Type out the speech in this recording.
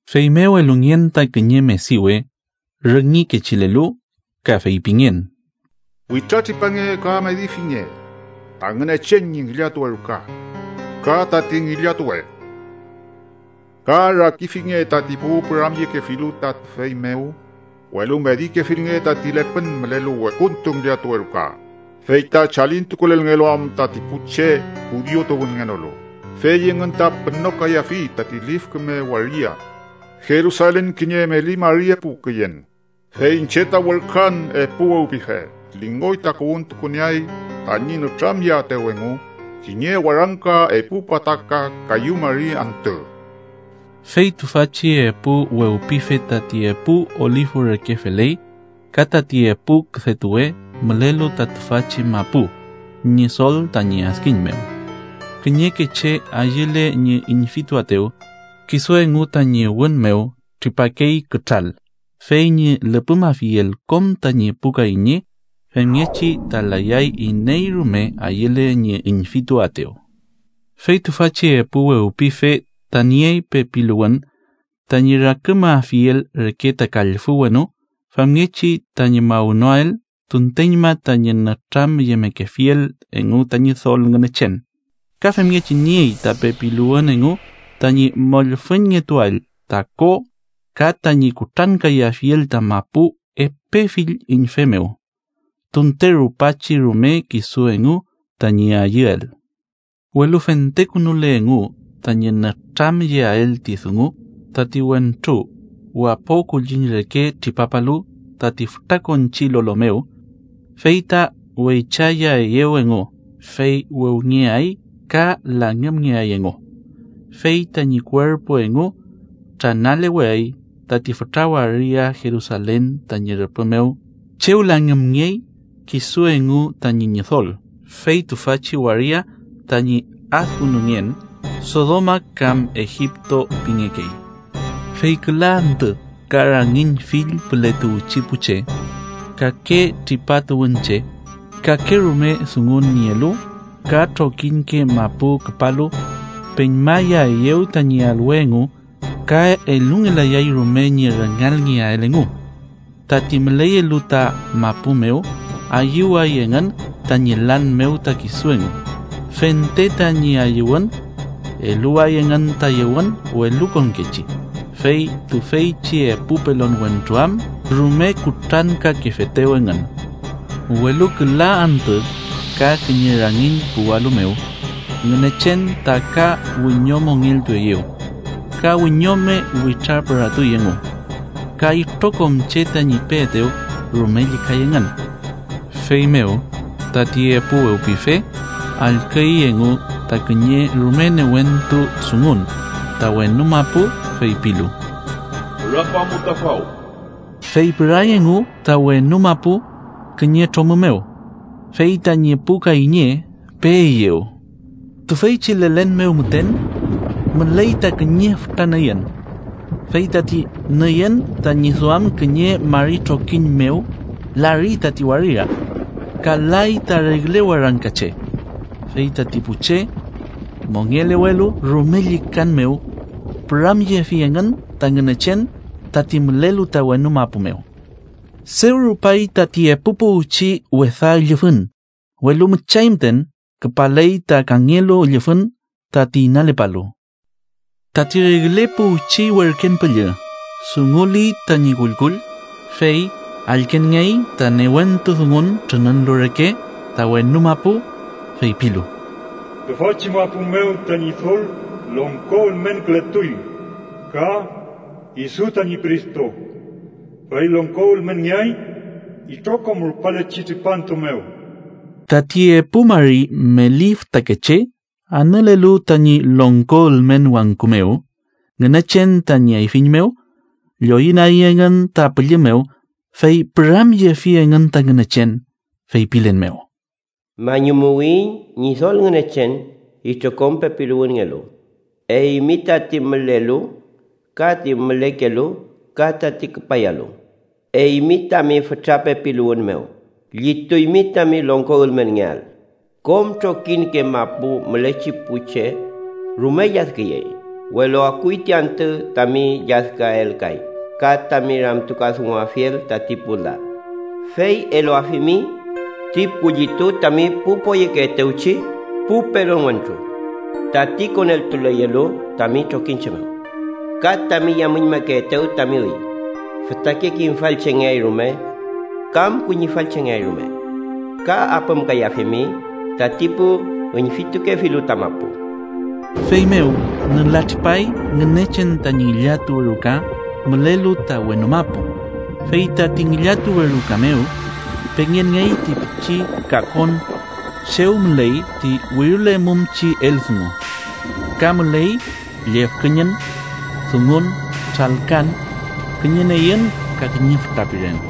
Feymew elungen ta kiñe mediwe, rüngi kechilelu, ka feypingen: “Witratripange ka medifinge ta Ngünechen ñi ngillatuwe ruka, ka tati ngillatuwe, ka rakifinge tati pu püramyekefilu ta tüfey mew. Welu medikefilnge tati lepün mülelu wekuntu ngillatuwe ruka, fey ta chalintukulelngelu am tati pu che judiu tuwünngenolu. Fey engün ta pünokayafi tati lif küme waria Jerusalen kiñe meli mari epu küyen. Fey iñche ta werküan epu wewpife, lingoy takuwün tukunieay, tañi nütramyeaetew engu kiñe warangka epu pataka kayu mari antü.” Fey tüfachi epu wewpife tati epu olifu reke feley ka tati epu küdetuwe mülelu ta tüfachi mapu ñi Ñidol tañi adkiñ mew. Kiñeke che ayüle ñi üñfituaetew, kisu engu tañi wün mew tripakey kütral, fey ñi lüpümafiel kom tañi pu kayñe. Femngechi ta layay iney rume ayüle ñi üñfituaetew. Fey tüfachi epu wewpife ta niey pepiluwün tañi rakümafiel reke ta kallfü wenu femngechi tañi mawnoael tunteñma tañi nütramyemekefiel engu ta Ñidol Ngünechen, ka femngechi niey ta pepiluwün engu tañi mollfüñngetuael ta ko ka tañi kutrankayafiel ta mapu epe fill üñfew mew, tunte rupachi rume kisu engu tañi ayüel. Welu fentekünule engu tañi nütramyeael ti dungu, tati wentru wapo kulliñ reke tripapalu tati fütrakonchi lolo mew, fey ta weychayaeyew engu, fey wewngeay ka langümngeay engu. Fey tañi kuerpu engu tranaleweay tati fütra waria Jerusalen tañi rüpü mew chew langümngey kisu engu tañi Ñidol, fey tüfachi waria tañi adkünungen Sodoma kam Egipto pingekey. Fey küla antü ka rangiñ fill püle tuwchi pu che, kake tripa tuwünche, kakerume dungun nielu ka trokiñke mapu küpalu peñmayaeyew tañi alwe engu ka elungelayay rume ñi rüngalngeael engu. Tati müleyelu ta mapu mew ayüway engün tañi lan mew ta kisu engu, fente tañi ayüwün eluway engün ta yewün welukonkechi, fey tüfeychi epu pelon wentru am rume kutrankakefetew engün. Welu küla antü ka kiñe rangiñ puwalu mew, Ngünechen ta ka wiñomongeltueyew ka wiñome witrapüratuy engu, ka itrokom che tañi peetew rume llükay engün. Feymew tati epu wewpife allküy engu ta kiñe rume newentu dungun ta wenu mapu, feypilu: “¡Pürapamu ta faw!” Fey püray engu ta wenu mapu kiñe tromü mew, fey tañi pu kayñe peeyew. Tüfeychi lelen mew müten müley ta kiñe fütra nüyün, fey tati nüyün tañi duam kiñe mari trokiñ mew lari tati waria, ka lay ta regle warangka che. Fey tati pu che mongelewelu, rume llükan mew püramyefi engün ta Ngünechen, tati mülelu ta wenu mapu mew. Dew rupay tati epu puwchi wesa üllüfün, welu müchay müten küpaley ta kangelu üllüfün tati inalepalu. Tati regle puwchi werken püllü dunguli tañi kullkull, fey allkenngey ta newentu dungun trününülu reke ta wenu mapu, feypilu: “Tüfachi mapu mew ta Ñidol longko ülmenkületuy ka kisu tañi Cristo, fey longko ülmenngeay itrokom rupalechi tripantu mew.” Tati epu mari meli fütakeche anülelu tañi longko ülmen wangku mew Ngünechen tañi ayfiñ mew, lloyünagi engün ta pülli mew, fey püramyefi engün ta Ngünechen, feypilen mew: “Mañumuwiyiñ, Ñidol Ngünechen, itrokom pepiluwünngelu, eymi tati mülelu ka ti mülekelu, ka tati küpayalu, eymi tami fütra pepiluwün mew llituymi tami longko ülmenngeael. Kom trokiñke mapu mülechi pu che rume lladküyey, welu akuy ti antü tami lladküael kay ka tami ramtukadunguafiel tati pu la, fey eluafimi ti kullitu tami pu poyekeetewchi pu pelon wentru, tati koneltuleyelu tami trokiñche mew ka tami yamüñmakeetew tami üy, fütake kimfal chengeay rume kam kuñifall chengeay rume, ka apümkayafimi tati pu üñfitukefilu ta mapu.” Feymew nülatripay Ngünechen tañi ngillatuwe ruka mülelu ta wenu mapu, fey tati ngillatuwe ruka mew pengenngey ti pichi kakon chew müley ti wirilemumchi eldungu. Ka müley llüfkeñün, dungun, tralkan, kiñe nüyün ka kiñe fütra piren.